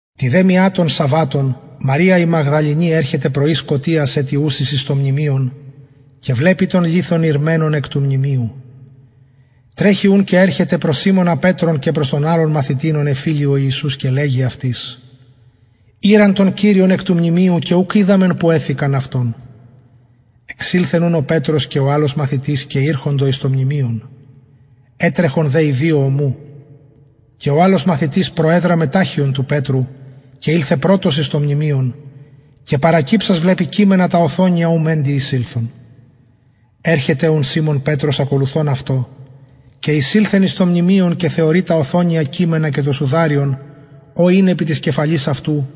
τη δε μια των σαββατων μαρια η μαγδαληνη ερχεται πρωι σκοτιας ετι ουσης εις το μνημειον και βλεπει τον λιθον ηρμενον εκ του μνημειου τρεχει ουν και ερχεται προς σιμωνα πετρον και προς τον αλλον μαθητην ον εφιλει ο ιησους και λεγει αυτοις ηραν τον κυριον εκ του μνημειου και ουκ οιδαμεν που εθηκαν αυτον εξηλθεν ουν ο πετρος και ο αλλος μαθητης και ηρχοντο εις το μνημειον ετρεχον δε οι δυο ομου και ο αλλος μαθητης προεδραμεν ταχιον του πετρου και ηλθεν πρωτος εις το μνημειον και παρακυψας βλεπει κειμενα τα οθονια ου μεντοι εισηλθεν ερχεται ουν σιμων πετρος ακολουθων αυτω και εισηλθεν εις το μνημειον και θεωρει τα οθονια κειμενα και το σουδαριον ο ην επι της κεφαλης αυτου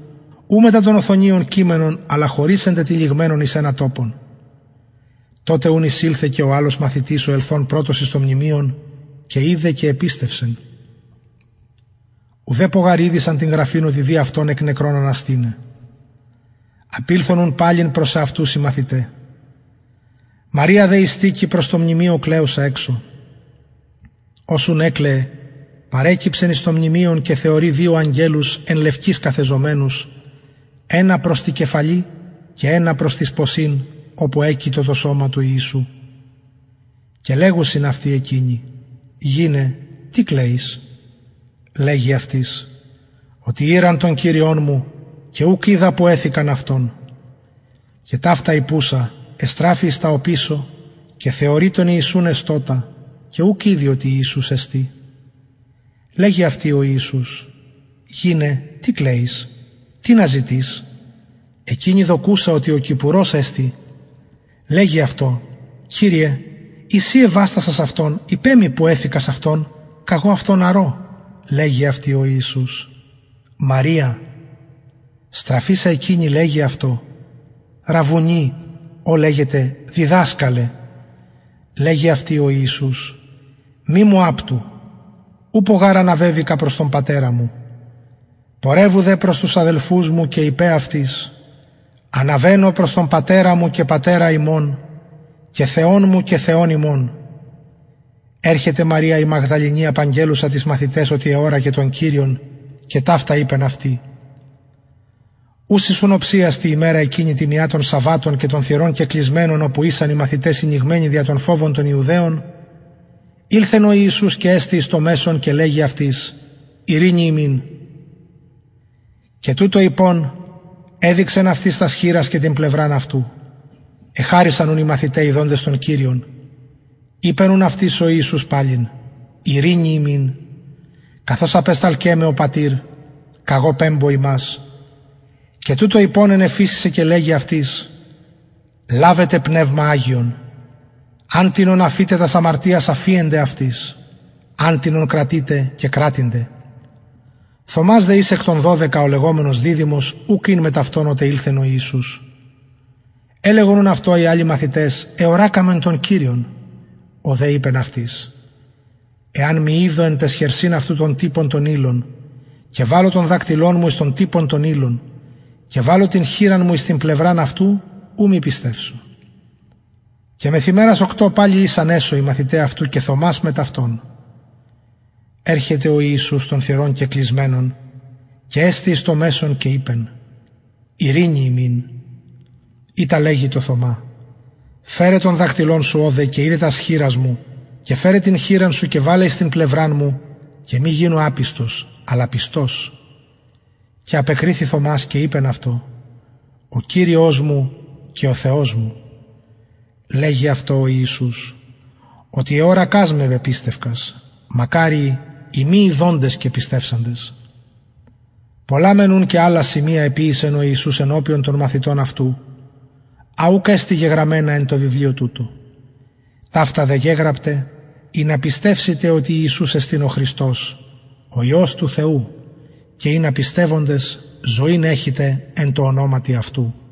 ου μετα των οθονιων κειμενον αλλα χωρις εντετυλιγμενον εις ενα τοπον τοτε ουν εισηλθεν και ο αλλος μαθητης ο ελθων πρωτος εις το μνημειον και ειδεν και επιστευσεν ουδεπω γαρ ηδεισαν την γραφην οτι δει αυτον εκ νεκρων αναστηναι απηλθον ουν παλιν προς εαυτους οι μαθηται μαρια δε ειστηκει προς το μνημειον κλαιουσα εξω ως ουν εκλαιεν παρεκυψεν εις το μνημειον και θεωρει δυο αγγελους εν λευκοις καθεζομενους ενα προς τη κεφαλη και ενα προς τοις ποσιν οπου εκειτο το σωμα του ιησου και λεγουσιν αυτη εκεινοι γυναι τι κλαιεις λεγει αυτοις οτι ηραν τον κυριον μου και ουκ οιδα που εθηκαν αυτον και ταυτα ειπουσα εστραφη εις τα οπισω και θεωρει τον ιησουν εστωτα και ουκ ηδει οτι ιησους εστιν λεγει αυτη ο ιησους γυναι τι κλαιεις τινα ζητεις εκεινη δοκουσα οτι ο κηπουρος εστιν λεγει αυτω κυριε ει συ εβαστασας αυτον ειπε μοι που εθηκας αυτον καγω αυτον αρω λεγει αυτη ο ιησους μαρια στραφεισα εκεινη λεγει αυτω ραββουνι ο λεγεται διδασκαλε λεγει αυτη ο ιησους μη μου απτου ουπω γαρ αναβεβηκα προς τον πατερα μου πορευου δε προς τους αδελφους μου και ειπε αυτοις αναβαινω προς τον πατερα μου και πατερα υμων και θεον μου και θεον υμων ερχεται μαρια η μαγδαληνη απαγγελλουσα τοις μαθηταις οτι εωρακεν τον κυριον και ταυτα ειπεν αυτη ουσης ουν οψιας τη ημερα εκεινη τη μια των σαββατων και των θυρων κεκλεισμενων οπου ησαν οι μαθηται συνηγμενοι δια τον φοβον των ιουδαιων ηλθεν ο ιησους και εστη εις το μεσον και λεγει αυτοις ειρηνη υμιν και τουτο ειπων εδειξεν αυτοις τας χειρας και την πλευραν αυτου εχαρησαν ουν οι μαθηται ιδοντες τον κυριον ειπεν ουν αυτοις ο ιησους παλιν ειρηνη υμιν καθως απεσταλκεν με ο πατηρ καγω πεμπω υμας και τουτο ειπων ενεφυσησεν και λεγει αυτοις λαβετε πνευμα αγιον αν τινων αφητε τας αμαρτιας αφιενται αυτοις αν τινων κρατητε κεκρατηνται θωμας δε εις εκ των δωδεκα ο λεγομενος διδυμος ουκ ην μετ αυτων οτε ηλθεν ο ιησους ελεγον ουν αυτω οι αλλοι μαθηται εωρακαμεν τον κυριον ο δε ειπεν αυτοις εαν μη ιδω εν ταις χερσιν αυτου τον τυπον των ηλων και βαλω τον δακτυλον μου εις τον τυπον των ηλων και βαλω την χειρα μου εις την πλευραν αυτου ου μη πιστευσω και μεθ ημερας οκτω παλιν ησαν εσω οι μαθηται αυτου και θωμας μετ αυτων ερχεται ο ιησους των θυρων κεκλεισμενων και εστη εις το μεσον και ειπεν ειρηνη υμιν ειτα λεγει τω θωμα φερε τον δακτυλον σου ωδε και ιδε τας χειρας μου και φερε την χειρα σου και βαλε εις την πλευραν μου και μη γινου απιστος αλλα πιστος και απεκριθη θωμας και ειπεν αυτω ο κυριος μου και ο θεος μου λεγει αυτω ο ιησους οτι εωρακας με πεπιστευκας μακαριοι οι μη ιδοντες και πιστευσαντες πολλα μεν ουν και αλλα σημεια εποιησεν ο ιησους ενωπιον των μαθητων αυτου α ουκ εστιν γεγραμμενα εν τω βιβλιω τουτω ταυτα δε γεγραπται ινα πιστευσητε οτι ιησους εστιν ο χριστος ο υιος του θεου και ινα πιστευοντες ζωην εχητε εν τω ονοματι αυτου